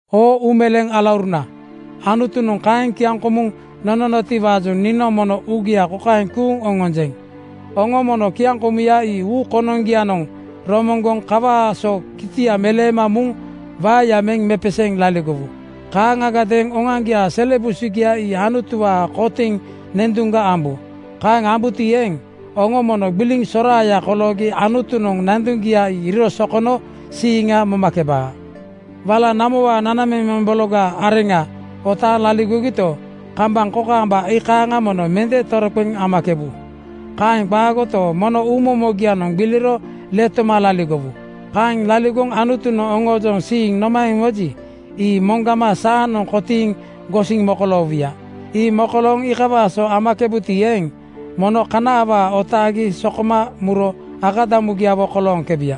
Oo uumeleeŋ alauruna, Anutunoŋ kaeŋ kiaŋkomuŋ nononotiwaajoŋ niinoŋ mono uugia kokaeŋ kuuŋ oŋonjeŋ: Oŋo mono kiaŋkomuya ii uu konoŋgianoŋ romoŋgoŋ kawaa so kitia meleema muŋ waeya meŋ mepeseeŋ laligowu. Kaaŋagadeeŋ oŋoaŋgiaa sele busugia ii Anutuwaa kotiŋ nanduŋga ambu. Kaeŋ ambuti eeŋ, oŋo mono gbiliŋ soraaya koloogi Anutunoŋ nanduŋgia ii iiro sokono siiŋa momakebaa. Wala namowaa nanamemeŋ bologaa areŋa otaaŋ laligogito, kambaŋ kokaamba iikaaŋa mono mende toroqeŋ amakebu. Kaeŋ qaagoto, mono uumomogianoŋ gbiliro letoma laligowu. Kaeŋ laligoŋ Anutunoŋ oŋoojoŋ siiŋ nomaeŋ moji, ii moŋgama saanoŋ kotiiŋ gosiŋ mokoloowuya. Ii mokolooŋ iikawaa so amakebuti eeŋ, mono kana awaa otaagi sokoma muro akadamugiawo kolooŋkebuya.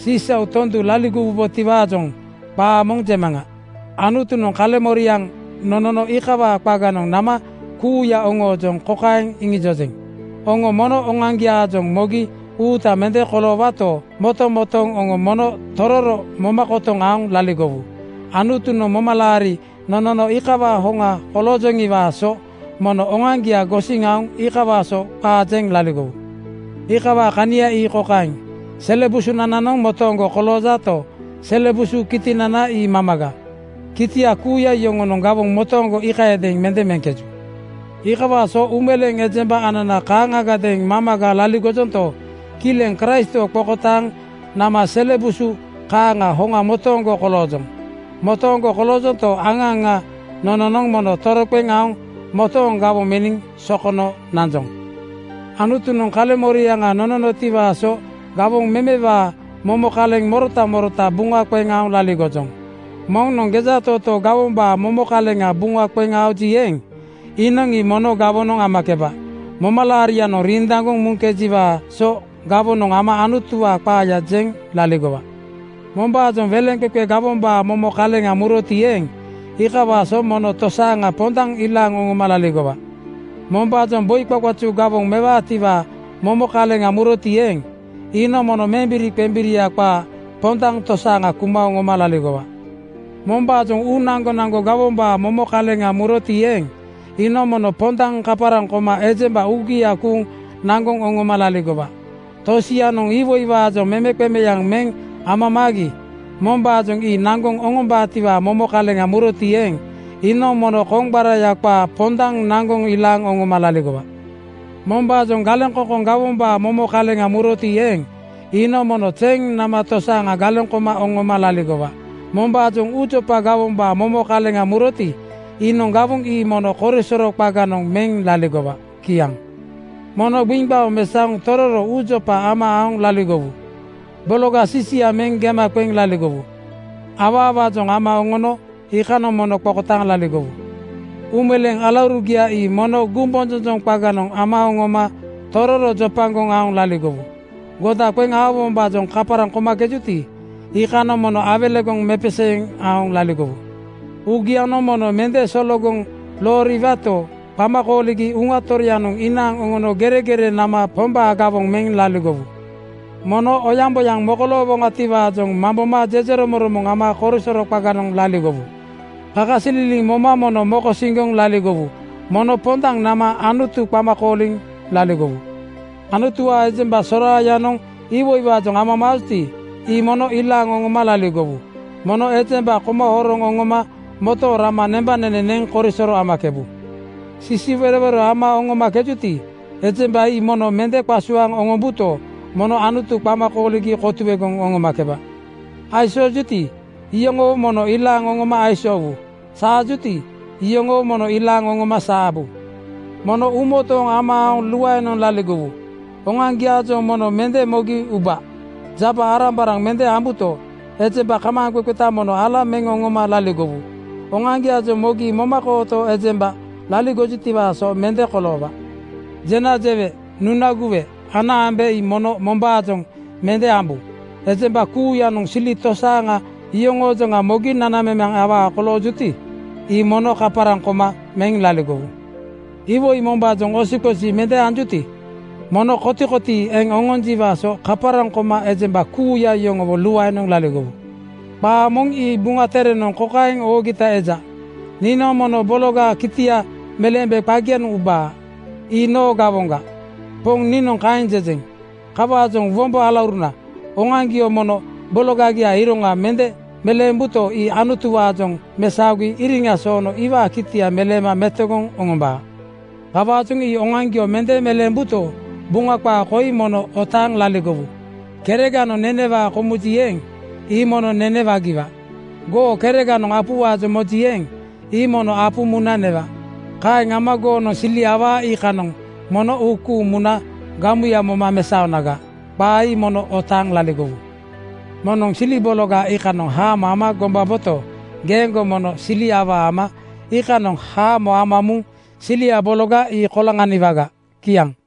Sisau tondu laligowubotiwaajoŋ qaa moŋ jemaŋa. Anutunoŋ kaleŋmoriaŋ nono iikawaa qaganoŋ nama kuuya oŋoojoŋ kokaeŋ iŋijojeŋ: Oŋo mono oŋoaŋgiaajoŋ mogi uuta mende koloowato, motomotooŋ oŋo mono tororo moma kotoŋ aoŋ laligowu. Anutunoŋ momalaari nonono iikawaa hoŋa kolooŋkejiwaa so mono oŋoaŋgia gosiŋ aoŋ iikawaa so qaa jeŋ laligowu. Iikawaa kania ii kokaeŋ: Sele busunananoŋ motooŋgo koloojato, sele busu kitinana ii mamaga. Kitia kuuya yoŋonoŋ gawoŋ motooŋgo iikayadeeŋ mende meŋkeju. Iikawaa so uumeleeŋ ejemba anana kaaŋagadeeŋ mamaga laligojonto, kileŋ Kraistwo qokotaaŋ nama sele busu kaaŋa hoŋa motooŋgo koloojoŋ. Motooŋgo koloojonto, aŋa aŋa nononoŋ mono toroqeŋ aoŋ motooŋ gawoŋ meniŋ sokono nanjoŋ. Anutunoŋ kaleŋmoriaŋa nononotiwaa so gawoŋ memewaa momo kaleŋ morota morota buŋa qeŋ aoŋ laligojoŋ. Moŋnoŋ gejatootoo gawombaa momo kaleŋa buŋa qeŋ aoji eeŋ, iinoŋ ii mono gawonoŋ amakeba. Momalaarianoŋ rindaŋgoŋ muŋkejiwaa so gawonoŋ ama Anutuwaa qaaya jeŋ laligowa. Mombaajoŋ weleŋqeqe gawombaa momo kaleŋa muroti eeŋ, iikawaa so mono tosaaŋa pondaŋ ilaaŋ oŋoma laligowa. Mombaajoŋ boi qaqazu gawoŋ mewaatiwaa momo kaleŋa muroti eeŋ, iinoŋ mono membiriqembiria qaa pondaŋ tosaaŋa kuma oŋoma laligowa. Mombaajoŋ uu naŋgonaŋgo gawombaa momo kaleŋa muroti eeŋ, iinoŋ mono pondaŋ kaparaŋ koma ejemba uugia kuuŋ naŋgoŋ oŋoma laligowa. Tosianoŋ iwoiwaajoŋ memeqemeaŋ meŋ amamaagi mombaajoŋ ii naŋgoŋ oŋombaatiwaa momo kaleŋa muroti eeŋ, iinoŋ mono koŋgbaraya qaa pondaŋ naŋgoŋ ilaaŋ oŋoma laligowa. Mombaajoŋ galeŋkoŋkoŋ gawombaa momo kaleŋa muroti eeŋ, iinoŋ mono zeŋ nama tosaaŋa galeŋ koma oŋoma laligowa. Mombaajoŋ uujopa gawombaa momo kaleŋa muroti, iinoŋ gawoŋ ii mono korisoro qaganoŋ meŋ laligowa. Kiaŋ. Mono gbiŋgbaoŋ mesaoŋ tororo uujopa ama aoŋ laligowu. Bologa sisia meŋ gema qeŋ laligowu. Awaawaajoŋ ama oŋono iikanoŋ mono qokotaaŋ laligowu. Uumeleeŋ alaurugia ii mono gumbonjonjoŋ qaganoŋ ama oŋoma tororo jopagoŋ aoŋ laligowu. Goda qeŋ aowombaajoŋ kaparaŋ komakejuti, iikanoŋ mono awelegoŋ mepeseeŋ aoŋ laligowu. Uugianoŋ mono mende sologoŋ looriwato, qama kooligi Uŋa Toroyanoŋ inaaŋ oŋono geregerenoŋ nama Pombaa gawoŋ meŋ laligowu. Mono oyaŋboyaŋ mokoloowoŋatiwaajoŋ mamboma jejeromoŋromoŋ ama korisoro qaganoŋ laligowu. Kakasililiŋ moma mono mokosiŋgoŋ laligowu. Mono pondaŋ nama Anutu qama kooliŋ laligowu. Anutuwaa ejemba soraayanoŋ iwoiwaajoŋ amamaajuti, ii mono ilaaŋ oŋoma laligowu. Mono ejemba koma horoŋ oŋoma motooŋ rama nembanene neŋ korisoro amakebu. Sisiwerowero ama oŋomakejuti, ejemba ii mono mende qasuaaŋ oŋombuto, mono Anutu qama kooligi kotuegoŋ oŋomakeba. Aisoojuti, iyoŋowo mono ilaaŋ oŋoma aisoowu. Saajuti, iyoŋowo mono ilaaŋ oŋoma saabu. Mono uumotooŋ ama aoŋ luaenoŋ laligowu. Oŋoaŋgiaajoŋ mono mende mogi uba. Jaba-arambaraŋ mende ambuto, ejemba kamaaŋqeqeta mono ala meŋ oŋoma laligowu. Oŋoaŋgiaajoŋ mogi momakooto ejembaga laligojutiwaa so mende koloowa. Jena jewe, nuna guwe, ana ambe ii mono mombaajoŋ mende ambu. Ejemba kuuyanoŋ sili tosaaŋa yoŋoojoŋa mogi nanamemeŋ awaa koloojuti, ii mono kaparaŋ koma meŋ laligowu. Iwoi mombaajoŋ osiqosi mende anjuti, mono kotikotii eŋ oŋonjiwaa so kaparaŋ koma ejemba kuuya yoŋowo luaenoŋ laligowu. Qaa moŋ ii Buŋa Terenoŋ kokaeŋ oogita eja, “Niinoŋ mono bologaa kitia meleembe qagianoŋ ubaa. Ii noo gawoŋga. Poŋ niinoŋ kaeŋ jejeŋ.” Kawaajoŋ wombo alauruna, oŋoaŋgio mono bologaa iroŋa mende meleembuto, ii Anutuwaajoŋ mesaogi iriŋa soono iwaa kitia meleema metogoŋ oŋombaa. Kawaajoŋ ii oŋoaŋgio mende meleembuto, Buŋa qaa koi mono otaaŋ laligowu, “Kereganoŋ nenewaa komuji eeŋ, ii mono nene wagiwa. Goo kereganoŋ apuwaajoŋ moji eeŋ, ii mono apu muna newa. Kaeŋ ama goonoŋ sili awaa iikanoŋ mono uu kuuŋ muna gamuya moma mesaonaga.” Qaa ii mono otaaŋ laligowu. Moŋnoŋ sili bologa iikanoŋ haamo ama gombaboto, geeŋgo mono sili awaa ama iikanoŋ haamo ama muŋ silia bologa ii koloŋaniwaga. Kiaŋ.